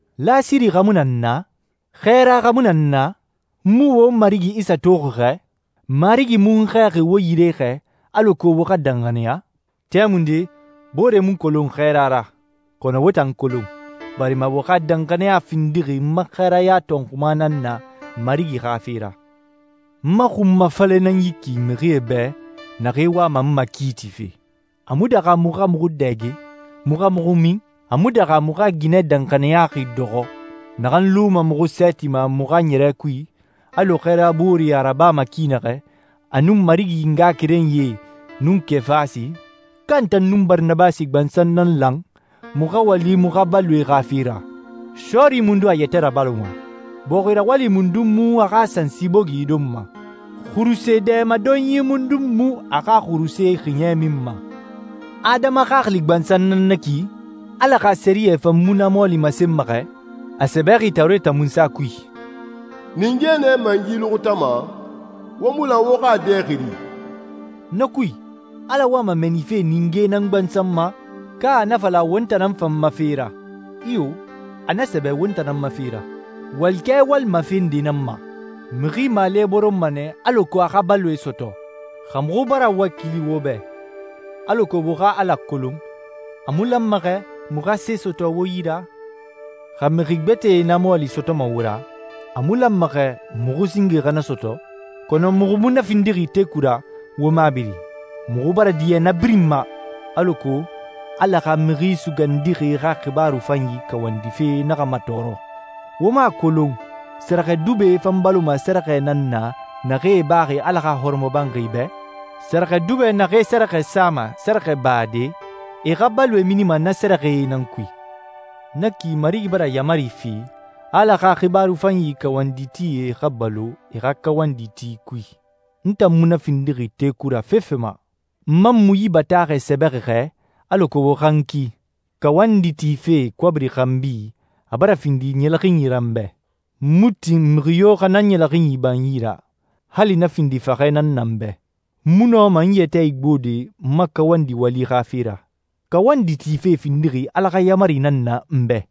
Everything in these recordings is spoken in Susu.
Lasiri xa mu na n na? Xɛɛra xa mu na n na? N mu won Marigi Isa toxi xɛ? Marigi mu n xɛɛxi wo yire xɛ, alako wo xa danxaniya? Tɛmunde booree mu n kolon xɛɛra ra, kɔnɔ wo tan n kolon, barima wo xa danxaniya findixi n ma xɛɛraya tɔnxuma nan na Marigi xa fe ra. N ma xunmafalɛ nan na ki mixie bɛ naxee wama n makiitife. A mu daxa muxu xa muxu dɛge, muxu xa muxu min? A mu daxa muxu xa ginɛ danxaniyaxi dɔxɔ, naxan luma muxu sɛɛti ma muxu xa ɲɛrɛ kui, alɔ xɛɛra booree a rabama ki naxɛ, a nun Marigi ngaxakerenyie nun Kefasi? Ka n tan nun Baranabasi gbansan nan lan muxu xa wali muxu xa baloe xa fe ra? Sɔɔri mundun a yɛtɛ rabaloma? Bɔxi rawali mundun mu a xa sansi bogi donma? Xuruse dɛmadonyi mundun mu a xa xuruse xiɲɛ minma? Adama xaxili gbansan nan na ki? Ala xa sɛriyɛ fan mu na mɔɔli masenma xɛ? A sɛbɛxi Tawureta Munsa kui, «Ninge nɛ mɛngi luxutama, wo mu lan wo xa a dɛ xiri.» Na kui, Ala wama mɛɛnife ningee nan gbansan ma, ka a na fala won tan nan fan ma fe ra? Iyo, a na sɛbɛ won tan nan ma fe ra. Walikɛ walima fe nde nan ma. Mixi maale boronma nɛ alako a xa baloe sɔtɔ. Xa muxu bara wakili wo bɛ alako wo xa Ala kolon, a mu lanma xɛ muxu xa se sɔtɔ wo yi ra? Xa mixi gbɛtɛe na mɔɔli sɔtɔma wo ra, a mu lanma xɛ muxu singe xa na sɔtɔ? Kɔnɔ muxu mu na findixi teku ra wo mabiri. Muxu bara diɲɛ na birin ma, alako Ala xa Mixi Sugandixi xa xibaaru fanyi kawandife naxa matɔɔrɔ. Wo mu a kolon sɛrɛxɛdubɛe fan baloma sɛrɛxɛe nan na naxee baxi Ala xa hɔrɔmɔbanxi bɛ? Sɛrɛxɛdubɛ naxee sɛrɛxɛ sama sɛrɛxɛbade, e xa baloe minima na sɛrɛxɛe nan kui. Na ki Marigi bara yaamari fi a Ala xa xibaaru fanyi kawanditie xa balo e xa kawandi ti kui. N tan mu na findixi teku ra fefe ma. N man mu yi bataaxɛ sɛbɛxi xɛ alako wo xa n ki. Kawandi tife kɔbiri xanbi a bara findi ɲɛlɛxinyi ra n bɛ. N mu tin mixi yo xa na ɲɛlɛxinyi ba n yi ra, hali na findi faxɛ nan na n bɛ. N mu nɔma n yɛtɛ igbode n ma kawandi wali xa fe ra. Kawandi tife findixi Ala xa yaamari nan na n bɛ.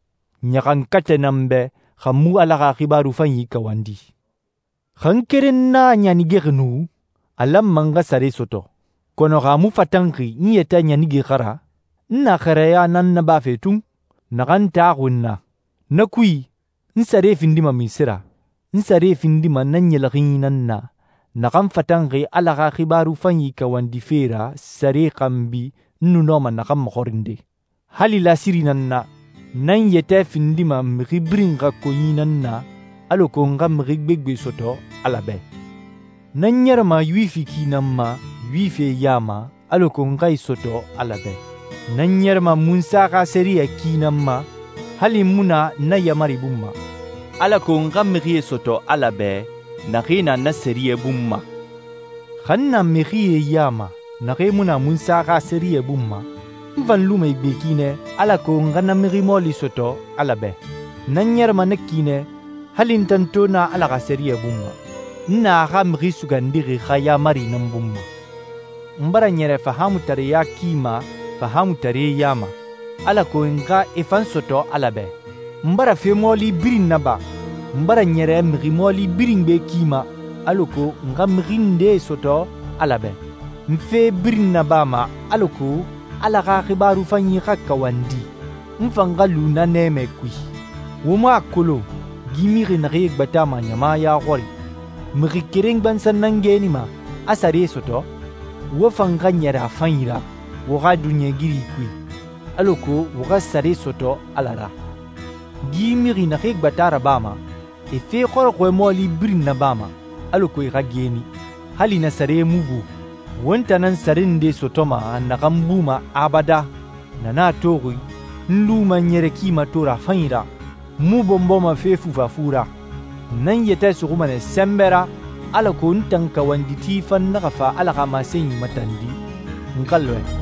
Ɲaxankatɛ na n bɛ, xa n mu Ala xa xibaaru fanyi kawandi. Xa n keren nan a ɲanigexi nu, a lanma n xa sare sɔtɔ. Kɔnɔ xa a mu fatanxi n yɛtɛ ɲanige xa ra, n na xɛɛraya nan nabafe tun, naxan taxuxi n na. Na kui, n sare findima munse ra? N sare findima na ɲɛlɛxinyi nan na, naxan fatanxi Ala xa xibaaru fanyi kawandife ra sare xanbi n nu nɔma naxan maxɔrinde. Hali lasiri nan n na, n nan n yɛtɛ findima mixi birin xa konyi nan na alako n xa mixi gbegbe sɔtɔ Ala bɛ. N nan ɲɛrɛma Yuwifi ki nan ma Yuwifie ya ma alako n xa e sɔtɔ Ala bɛ. N nan ɲɛrɛma Munsa xa sɛriyɛ ki nan ma, hali n mu na na yaamari bun ma, alako n xa mixie sɔtɔ Ala bɛ naxee na na sɛriyɛ bun ma. Xa n na mixie ya ma naxee mu na Munsa xa sɛriyɛ bun ma, n fan luma e gbe ki nɛ, alako n xa na mixi mɔɔli sɔtɔ Ala bɛ. N nan ɲɛrɛma na ki nɛ hali n tan to na Ala xa sɛriyɛ bun ma. N na a xa Mixi Sugandixi xa yaamari nan bun ma. N bara ɲɛrɛ fahaamutareɲa ki ma fahaamutaree ya ma, alako n xa e fan sɔtɔ Ala bɛ. N bara fe mɔɔli birin naba, n bara ɲɛrɛ mixi mɔɔli birin gbe ki ma, alako n xa mixi ndee sɔtɔ Ala bɛ. N fe birin nabama alako Ala xa xibaaru fanyi xa kawandi, n fan xa lu na nɛmɛ kui. Wo mu a kolon gi mixi naxee gbatama ɲama ya xɔri, mixi keren gbansan nan geenima, a sare sɔtɔ? Wo fan xa ɲɛrɛ a fanyi ra wo xa duniɲɛigiri kui, alako wo xa sare sɔtɔ Ala ra. Gi mixi naxee gbata rabama, e fe xɔrɔxɔɛ mɔɔli birin nabama, alako e xa geeni, hali na sare mu bu. Won tan nan sare nde sɔtɔma naxan buma abadan. Na nan a toxi n luma n ɲɛrɛ ki mato ra a fanyi ra, n mu bɔnbɔma fe fufafu ra. N nan n yɛtɛ suxuma nɛ sɛnbɛ ra, alako n tan kawanditi fan naxa fa Ala xa masenyi matandi, n xa lɔɛ.